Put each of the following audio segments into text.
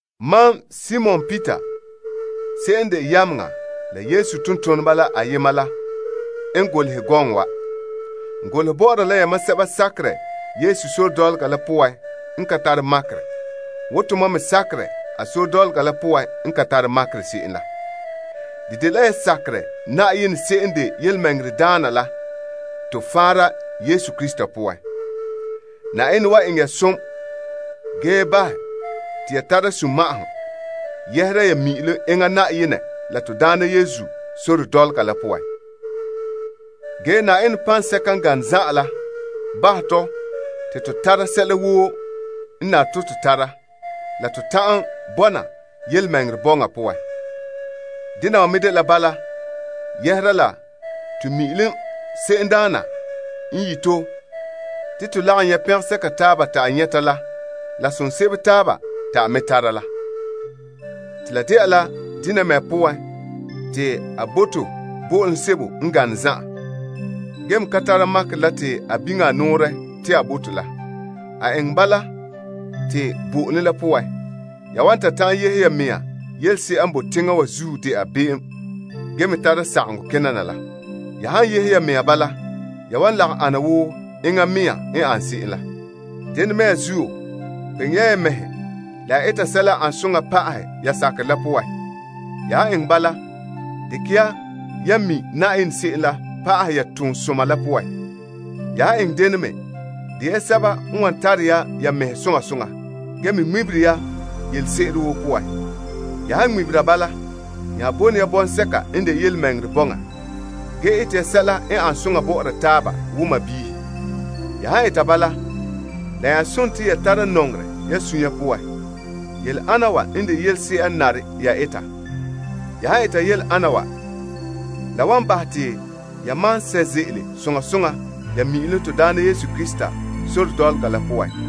Mam Simon Peter se'em n de yameŋa la Yesu tontoneba la ayema la n golehɛ gɔŋɔ wa. N golehɛ bɔ'ɔra la yamam sɛba sakerɛ Yesu sore dɔlɔga la poan n ka tara makerɛ wo tomam me sakerɛ a sore dɔlɔga la poan n ka tare makerɛ se'em la. De dela ya sakerɛ Na'ayenɛ se'em n de yelemɛŋɛrɛdaana la to faanra Yesu Krista poan. Na'ayenɛ wan eŋɛ ya som ge bahɛ te ya tara sunma'ahom yɛhera ya mi'ilom enŋa Na'ayenɛ la to Daana Yesu sore dɔlɔga la poan. Ge Na'ayenɛ paŋsɛka n gane zan'an la bahɛ tɔ te to tara sɛla woo n nare to tara la to ta'an bɔna yelemɛŋɛrɛ bɔŋa poan. Dena wa me de bala yɛhera la to mi'ilom se'emdaana n yi' to te to lagom nyɛ' pɛngɛsɛka taaba te a nyɛta la la som sebo taaba te a me tara la. La dela dena mea poan te a bo to bo'olom sebo n gane zan'an, gee me ka tara makerɛ la te a biŋe a nɔɔrɛ te a bo to la. A eŋɛ bala te bo'olom la poan, ya wan ta ta'an yehe ya mea yelese'a n boe teŋa wa zuo de'a be'em, ge tara sagaŋɔ kena na la. Ya han yehe ya mea bala, ya wan lagom ana wo enŋɛ mea n an se'em la. Dena mea zuo, kpeŋe ya ya mɛhe la ya eta sɛla n ane soŋa pa'ahɛ ya sakerɛ la poan. Ya han eŋɛ bala, dekɛ ya yan mi' Na'ayenɛ se'em la pa'ahɛ ya toonsoma la poan. Ya han eŋɛ dene me, de ya sɛba n wan tara ya ya mɛhe soŋa soŋa, ge me ŋmebere ya yelese'ere woo poan. Ya han ŋmebera bala, nya bone ya bɔŋsɛka n de yelemɛŋɛrɛ bɔŋa, Ge ete ya sɛla n ane soŋa bɔ'ɔra taaba wo sɔɔnrɔ. Ya han eta bala, la nya sontii ya tare ya nɔŋerɛ ya sunya poan. Yele ana wa n de yelese'a n nare ya eta. Ya han eta yele ana wa, la wan bahɛ te ya maan sɛ' ze'ele soŋa soŋa ya mi'ilom to Daana Yesu Krista sore dɔlɔga la poan.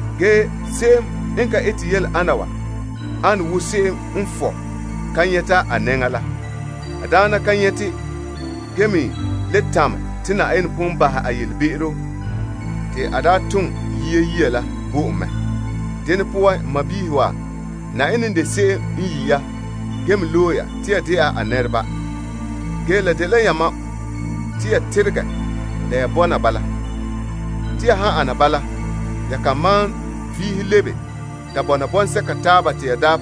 Ge se'em n ka ete yele ana wa ane wo se'em n fɔ' ka nyɛta a nɛŋa la. A daana ka nyɛte, ge me le tamɛ te Na'ayenɛ pon bahɛ a yelebe'seto te a daa tom yia saŋa la bo en mɛ. Dene poan, n sɔɔnrɔ wa, Na'ayenɛ n de se'em n yi' ya ge me loe ya te ya dɛna a nɛreba. Ge la dela yamam te ya teregɛ la ya bɔna bala. Te ya han ana bala, ya kan malom vihe lebe ta bɔna bɔŋsɛka taaba.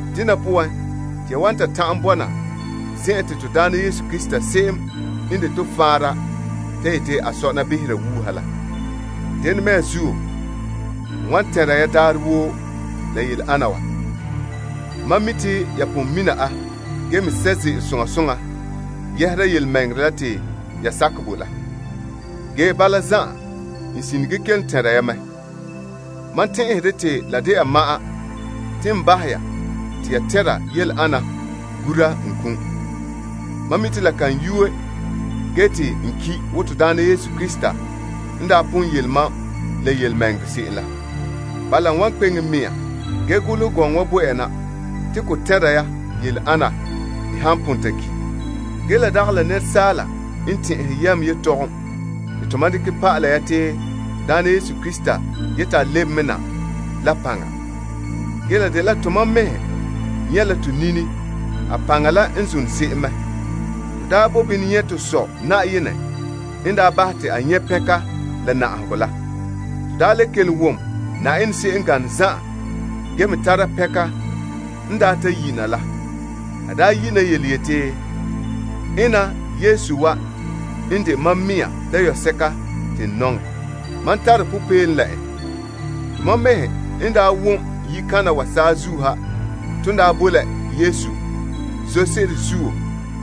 Dena poan, te ya wan ta ta'an bɔna zen'an te to Daana Yesu Krista se'em n de to faanra ta sɔna behera wuuha la. Yele ana mea zuo, n wan tɛnra ya daarɛ woo. Mam mi' te ya pon mina a, ge me sɛ' ze'ele soŋa soŋa yɛhera yelemɛŋɛrɛ la te ya sakɛ bo la. Ge bala zan'an, n sine ge kelom tɛnra ya mɛ. Mam tɛn'ɛhɛ dɛ te la dela ma'an te n bahɛ ya te ya tɛnra yele ana gura n kum. Mam me mi' te la kan yu'ɛ ge te n ki' wo to Daana Yesu Krista n daa pon yele mam la yelemɛŋɛrɛ se'em la. Bala, n wan kpeŋe n mea ge golehɛ gɔŋɔ wa bo ya na te ko tɛnra ya yele ana n han pon ta ki'. Ge la dagɛ la sɔlema te tomam dekɛ pa'alɛ ya te to Daana Yesu Krista yeti a lebe me na la paŋa. Ge la dela tomam mɛhe nyɛ' la to nini a paŋa la n zone se'em mɛ. To daa bo bini nyɛ' to Sɔ' Na'ayenɛ n daa bahɛ te a nyɛ' pɛnka la na'ahegɔ la. To daa le kelom wom Na'ayenɛ se'em n gane zan'an, ge me tara pɛnka n daa ta yi' na la. A daa yi' na yeti, Mam dayɔba'arɛ n wana te mam suunre kɛn'. Tomam mɛhe n daa wom yikana wa saazuo ha ton daa boe la Yesu Yenɛ toolom zoore la zuo.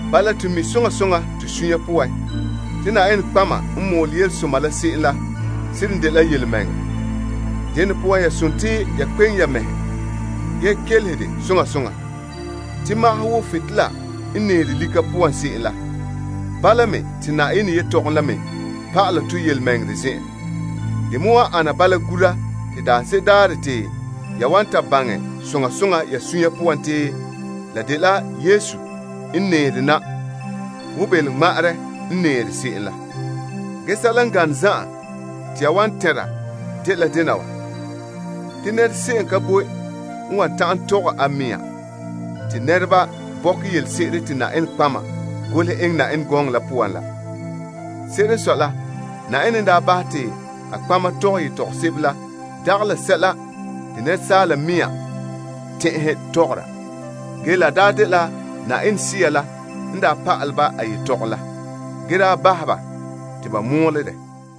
Bala to mi' soŋa soŋa to suunre poan te nɔtɔgɔheba n mɔɔlɛ yelesoma la se'em la seren dela yelemɛŋɛrɛ. Dene poan, ya sontii ya kpe'eŋe ya mɛhe, ge kelehe de soŋa soŋa. Te, magahɛ wo butolela n nɛɛre lika poan se'em la. Bala me, te Na'ayenɛ yetɔgom la me pa'ala tɔ yelemɛŋɛrɛ zen'en. De me wan ana bala gura te daanse'ere daarɛ te ya wan ta baŋɛ soŋa soŋa ya suunre poan te la dela Yesu n nɛɛre na wo belomŋma'arɛ n nɛɛre se'em la. Ge sɛla n gane zan'an te ya wan tɛnra dela dena wa. Te se'em ka boe n wan ta'an tɔgɛ a mɛŋa te nɛreba bɔkɛ yelese'ere te Na'ayenɛ nɔtɔgɔha golehɛ Yenɛ gɔŋɔ la. Se'ere n sɔe la, Na'ayenɛ n daa bahɛ te a nɔtɔgɔheba tɔgɛ yetɔgom sebo la dagɛ la sɛla te asaala mɛŋa tɛn'ɛhɛ tɔgɔra. Ge la daa dela Na'ayenɛ Sea la n daa pa'alɛ ba a yetɔgom la, ge daa bahɛ ba te ba mɔɔla dɛ.